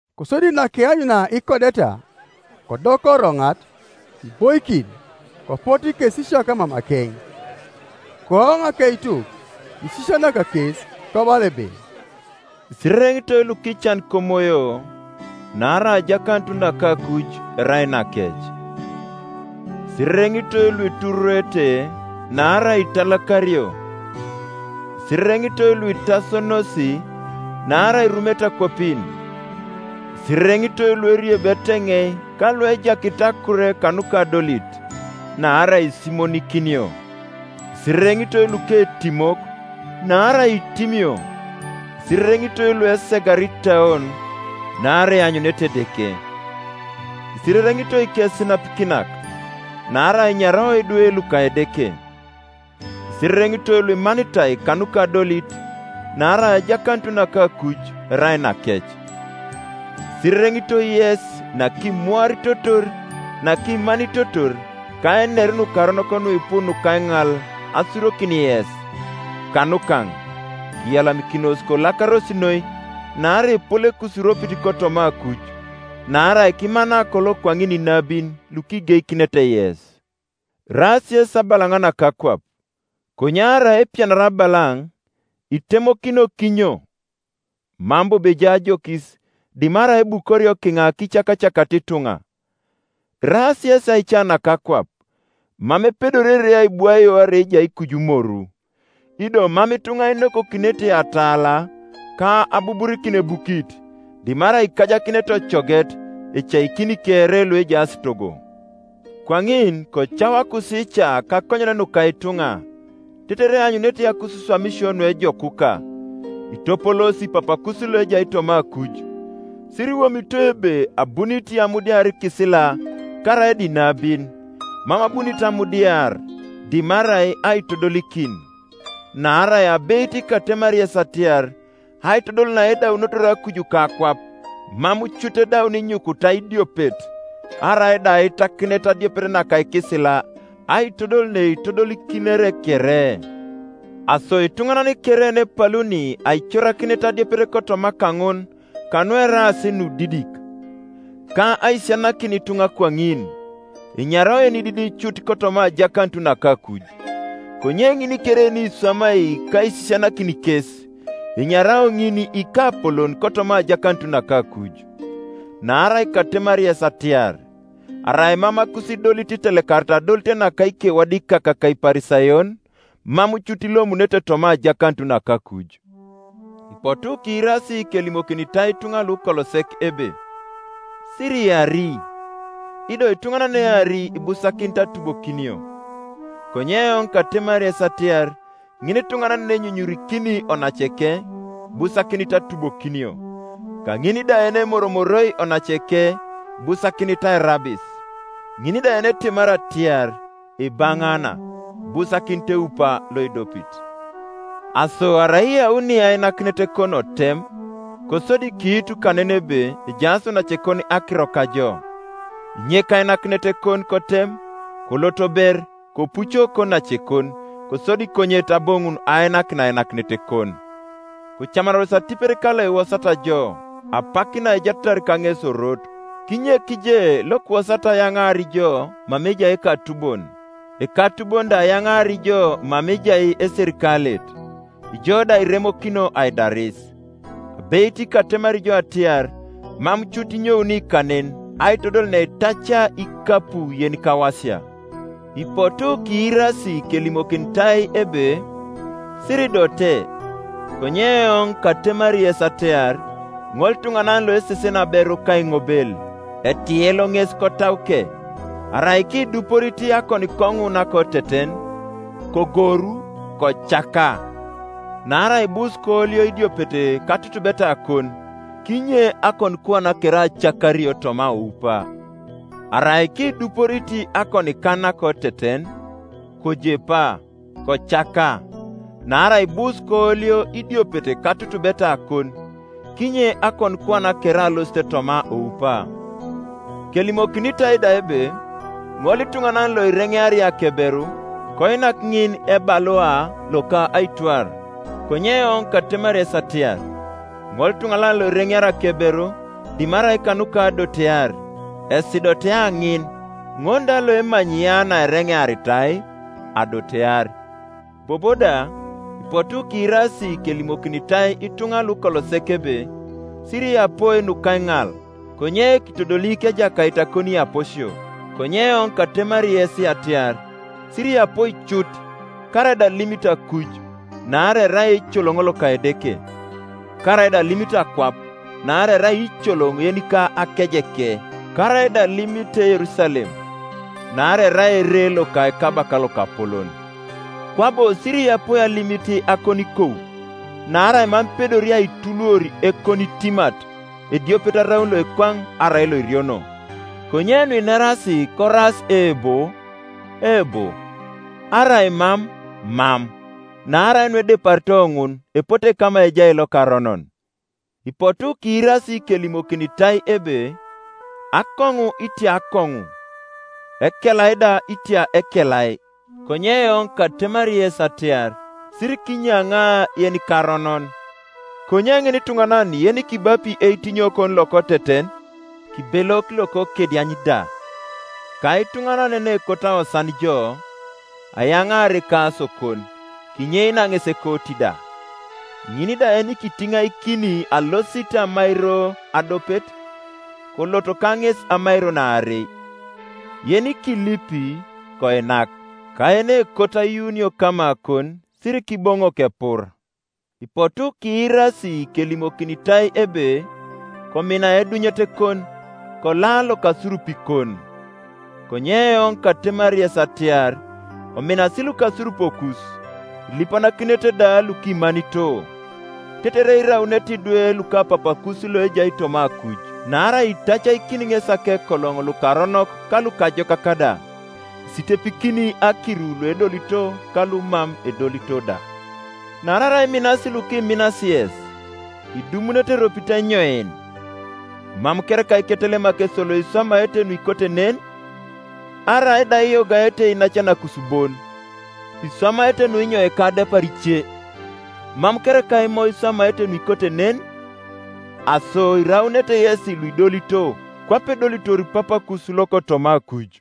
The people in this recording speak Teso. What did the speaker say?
Kosodi nakeanyunia ikodeta, kodoka oroŋat: kiboikin, kopotu ikekesisiak mamakeŋ. Kooŋ akeituk, kisisianak kes, kobala ebe: “Isirereŋitoi lukican komoyo; naarai ajakanut naka akuj erai nakec. “Isirereŋitoi luitururuete: naarai italakario. “Isirereŋitoi luitasonos: naarai irumete akwapin. “Isirereŋitoi lueriebi eteŋei ka luejakit akur kanuka adolit: naarai isimonikinio. “Isirereŋitoi luketimok: naarai itimio. “Isirereŋitoi luesegara itauon: naarai eanyunete Edeke. “Isirereŋitoi ikesinapikinak: naarai enyarao idwe luka Edeke. “Isirereŋitoi luimanitai kanuka adolit: naarai ajakanut naka akuj erai nakec. “Isirereŋitoi yes nakimuaritotor, nakimanitotor, ka einer nukaronok nuipu nuka aiŋal asurokin yes, kanukaŋ. Kiyalamikinos, kolakaros noi: naarai epol ekusiropit kotoma akuj: naarai kimana kolo kwaŋin inabin lukigeikinete yes. “Iraas yesi abalaŋ naka akwap; konye arai kepianiar abalaŋ, itemokinio kinyo? Mam bobo ejai ajokis, dimarai ebukorio kiŋa kicakacakata ituŋa. “Iraas yesi aica naka akwap. Mam epedori ere aibwaio arai ejai kuju moru. Ido mam ituŋa inokokinete atala, ka abuburikin ebukit, dimarai ikajakinete ocoget, ecaikini kere luejaas togo. Kwaŋin kocau akusiica kakonyen nuka ituŋa, tetere eanyunete akusiswamisio nuejokuka, kitopoloosi Papakus loejai toma akuj. “Siriwomito ebe abunit amudiar ikisila karaida inabin: mam abunit amudiar, dimarai aitodolikin. Naarai abeit katemari yes atiar, Aitodol naedaunotor akuj ka akwap, mam cut edaun inyukuta idiopet, karaida aitakinet adiopet naka ikisila, aitodol neitodolikinere kere. Aso ituŋanan kere yenepaluni aicorakinet adiopet kotoma kaŋun kanueraas nudidik, ka aisisianakin ituŋa kwaŋin, enyarao yenididi cut kotoma ajakanut naka akuj: konye ŋin kere yeniswamai ka aisisianakin kes, enyarao ŋin ikapolon kotoma ajakanut naka akuj. Naarai katemari yes atiar, arai mam akusidolit itelekarit adolit naka ikewadikak ka Iparisayon, mam cut ilomunete toma ajakanut naka akuj. “Ipotu kiirasi kelimokinitai ituŋa lukolo sek ebe, Siriari; ido ituŋanan yeneari ibusakinit atubokinio. Konye eoŋ katemari yes atiar, Ŋinituŋanan yenenyunyurikini onaceke ibusakinit atubokinio; ka ŋin da yenemoromoroi onaceke ibusakinit airabis; ŋin da yenetemari atiar, Ibaŋaanal Ibusakinit eupa loidopit. Aso arai iyauni ainakinetekon otem, kosodi kiitu kanen ebe ejaas onacekon akiro kajo, kinyek ainakinetekon kotem, kolot ber; kopuco konacekon, kosodi konyet aboŋun ainakin ainakinetekon. Kocamanaros atipet kalokiwosat jo, apak naijaatatar kaŋes orot; kinyek je lokiwosat ayaŋaar jo mama ejai ekatubon, ekatubon da ayaŋaar jo mama ejai eserikalet, ijo da kiremokinio aidaris. Abeit katemari jo atiar, Mam cut inyouni kanen, aitodol neitacia ikapu yenikawasia. “Ipotu kiirasi kelimokinitai ebe, Siridote. Konye eoŋ katemari yes atiar, Ŋolituŋanan loeseseni aberu kaiŋobel, etielo ŋes kotauke. Arai kiduporit akonikoŋu nakoteten, kogoru, kocaka: naarai ibus koolio idiopet katutubetakon, kinye akonikuan kere acakario toma oupa. Arai kiduporit akonikan nakoteten, kojepa, kocaka; naarai ibus koolio idiopet katutubetakon, kinye akonikuan kere alosit toma oupa. “Kelimokinitai da ebe, ŋolituŋanan loireŋeari akeberu, koinak ŋin ebalua loka aitwar: konye eoŋ katemari yes atiar, ŋolituŋanan loireŋeari akeberu, dimarai kanuka adotear, esidotea ŋin: ŋol da loemanyi ya naereŋearitai, adotear. “Bobo da, ipotu kiirasi kelimokinitai ituŋa lukolo sek ebe, Siriyapoi nukaiŋal, konye kitodolik Ejakait akoniiyaposio. Konye eoŋ katemari yes atiar, Siriyapoi cut; karaida alimit akuj, naarai erai eicoloŋ loka Edeke; karaida alimit akwap, naarai erai iicoloŋ yenika akejeke; karaida alimit Yerusalem, naarai erai ere loka Ekabaka lokapolon. Kwabo siriyapoi alimit akonikou, naarai mam ipedori aituluor ekonitimat ediopet araun Ioekwaŋ arai loiriono. Konye nuineras koraas Eebo, eebo, arai Mam, mam: naarai nuedeparito ŋun epote kama ejai lokaronon. “Ipotu kiirasi kelimokinitai ebe, Akoŋu itia akoŋu, ekelai da itia ekelai. “Konye eoŋ katemari yes atiar, Sirikinyaŋa yenikaronon: konye ŋinituŋanan yenikibapi eitinyokon lokoteten, kibelok lokokediany da. Ka ituŋanan yenekot awoosan jo, ayaŋaar ekasokon, kinyeinia ŋes ekooti da. Ŋin da yenikitiŋaikini alosit amairo adiopet, kolot ka ŋes amairon aarei. Yenikilipi, koinak, ka yenekot ayuunio kamakon sirikiboŋok epur. “Ipotu kiirasi kelimokinitai ebe, Komina eidunyetekon, kola lokasurupikon. Konye eoŋ katemari yes atiar, Kominasi lukasurupokus, kilipanakinete da lukimanito; tetere iraunete idwe luka Papakus loejai toma akuj; naarai itacaikini ŋesi akekoloŋ lukaronok ka lukajokak da, isitepikini akiru luedolito ka lumam edolito da. Naarai arai iminasi lukiminas yes, idumunete eropit enyoin? Mam kereka iketelemak esolo iswamaete nuikote nen? Arai da iyogaete iinacanakus bon, iswamaete nunyoika adepar ice? Mam kereka Imo iswamaete nuikote nen? Aso iraunete yesi luidolito, kwape edolitor Papakus lokotoma akuj.